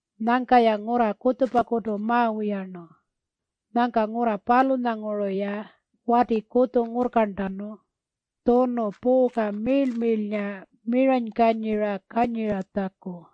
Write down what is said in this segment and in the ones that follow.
Nyangka-ya ngurra kutjupakutu mawiyarnu. Nyangka ngurra palunyanguru-ya wati kutju ngurrkarntanu tjunu puuka miirl-miirlnga miranykanyira kanyiratjaku.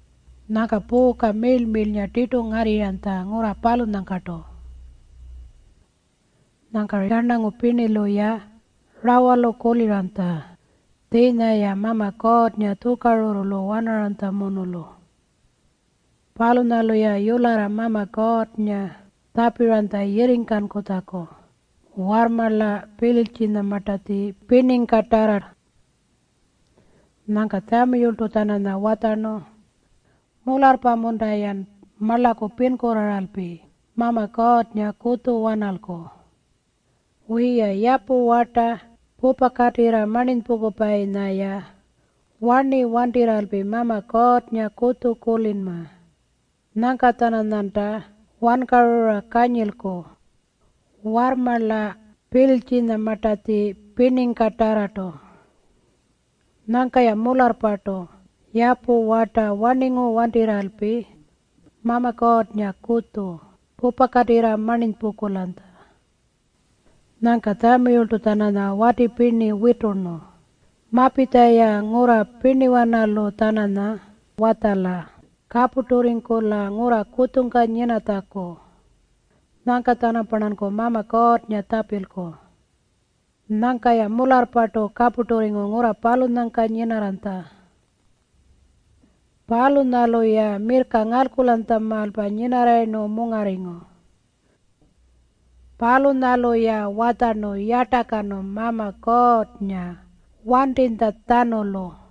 Nyangka puuka miirl-miirlnga tirtu ngarrirranytja ngurra palunyangkartu. Nyangka yarnangu pirnilu-ya rawalu kuliranytja tjiinya-ya Mama Kuurrnga tjukarurrulu wanaranytjamunulu. Palunyalu-ya yularra Mama Kuurrnga tjapiranytja yirringkankutjaku warrmarla Pilitjinyamartatji pirningkatarra. Nyangka Tjamiyultu-tjananya watjarnu, “Mularrpa-munta-yan marlaku pinkurraaralpi Mama Kuurrngakutju wanalku? Wiya, yapu warta pupakatirra marninypungkupayinya-ya warni wantirralpi Mama Kuurrngakutju kulinma. Nyangka-tjananyanta wankarura kanyilku warrmarla Pilitjinyamartatji pirningkatarrartu.” Nyangka-ya mularrpartu yapu warta warningu wantirralpi Mama Kuurrngakutju pupakatirra marninypungkulanytja. Nyangka Tjamiyultu-tjananya wati pirni witurnu, “Mapitja-ya ngurra pirniwanalu-tjananya watjala kapurturringkula ngurra kutjungka nyinatjaku. Nyangka-tjanamparnanku Mama Kuurrnga tjapilku.” Nyangka-ya mularrpartu kapurturringu ngurra palunyangka nyinarranytja. Palunyalu-ya mirrka ngalkulanytjamaalpa nyinarrayirnu mungarringu. Palunyalu-ya watjarnu yartakanu Mama Kuurrnga wantinytjatjanulu.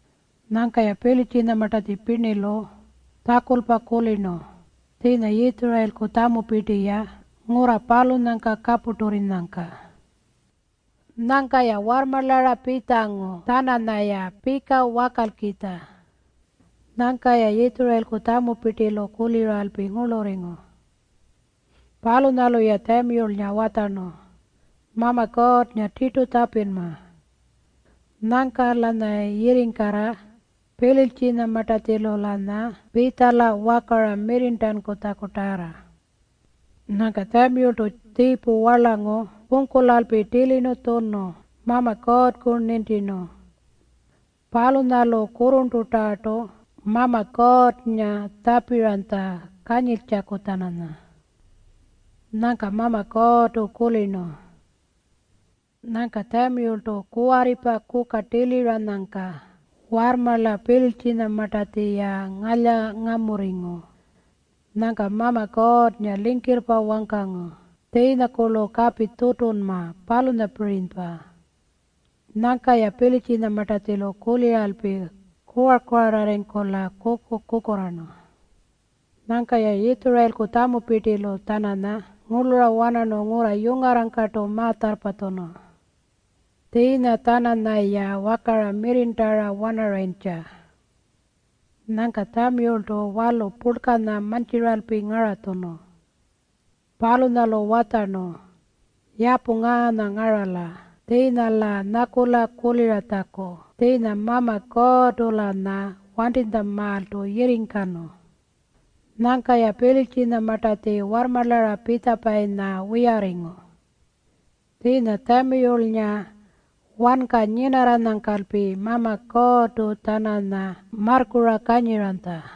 Nyangka-ya Pilitjinyamartatji pirnilu tjakulpa kulirnu tjiinya Yitjurayilku tjamupirti-ya ngurra palunyangka kapurturrinyangka. Nyangka-ya warrmarlara pitjangu-tjananya pika wakalkitja. Nyangka-ya Yitjurayilku tjamupirtilu kuliralpi ngurlurringu. Palunyalu-ya Tjamiyulnga watjarnu, “Mama Kuurrnga tirtu tjapinma. Nyangka-lanyayi yirringkala Pilitjinyamartatjilu-lanya pitjala wakara mirrirntankutjakutarra.” Nyangka Tjamiyultu tjiipu warlangu pungkulalpi tilirnu tjunu Mama Kuurrku nintirnu. Palunyalu kurrurntutarrartu Mama Kuurrnga tjapiranytja kanyiltjaku-tjananya. Nyangka Mama Kuurrtu kulirnu. Nyangka Tjamiyultu kuwarripa kuka tiliranyangka warrmarla Pilitjinyamartatji-ya ngalyangamurringu. Nyangka Mama Kuurrnga lingkirrpa wangkangu. Tjiinyakurlu kapi tutunma, palunyapirinypa. Nyangka-ya Pilitjinyamartatjilu kuliralpi kuwar-kuwararringkula kuku-kukurraarnu. Nyangka-ya Yitjurayilku tjamupirtilu-tjananya ngurlura wanarnu ngurra yungarrangkartu ma-tjarrpatjunu. Tjiinya-tjananyaya wakara mirrirntara wanarayintja. Nyangka Tjamiyultu walu purlkanya mantjiralpi ngaratjunu. Palunyalu watjarnu, “Yapu ngaanya ngarala tjiinya-lan nyakula kuliratjaku tjiinya Mama Kuurrtu-lanya wantinytjamaaltu yirringkanu.” Nyangka-ya Pilitjinyamartatji warrmarlara pitjapayinya wiyarringu. Tjiinya Tjamiyulnga wanka nyinarranyangkalpi Mama Kuurrtu-tjananya marrkura kanyiranytja.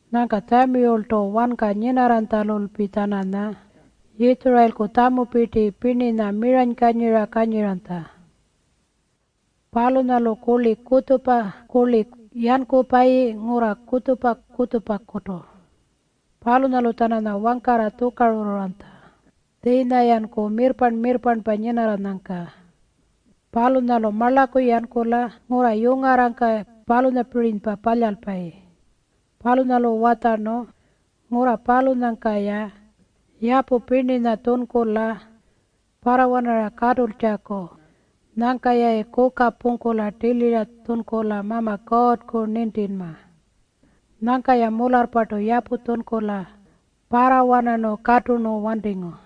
Nyangka Tjamiyultu wanka nyinarranytjalulpi-tjananya Yitjurayilku tjamupirti pirninya miranykanyira kanyiranytja. Palunyalu kurli kutjupa kurli yankupayi ngurra kutjupa-kutjupakutu. Palunyalu-tjananya wangkarra tjukarurruranytja tjiinya-yanku mirrparn-mirrparnpa nyinarranyangka. Palunyalu marlaku yankula ngurra yungarrangka palunyapirinypa palyalpayi. Palunyalu watjarnu ngurra palunyangka-ya yapu pirninya tjunkula parrawanara katultjaku nyangka-yayi kuka pungkula tilira tjunkula Mama Kuurrku nintinma. Nyangka-ya mularrpartu yapu tjunkula parrawanarnu katurnu wantingu.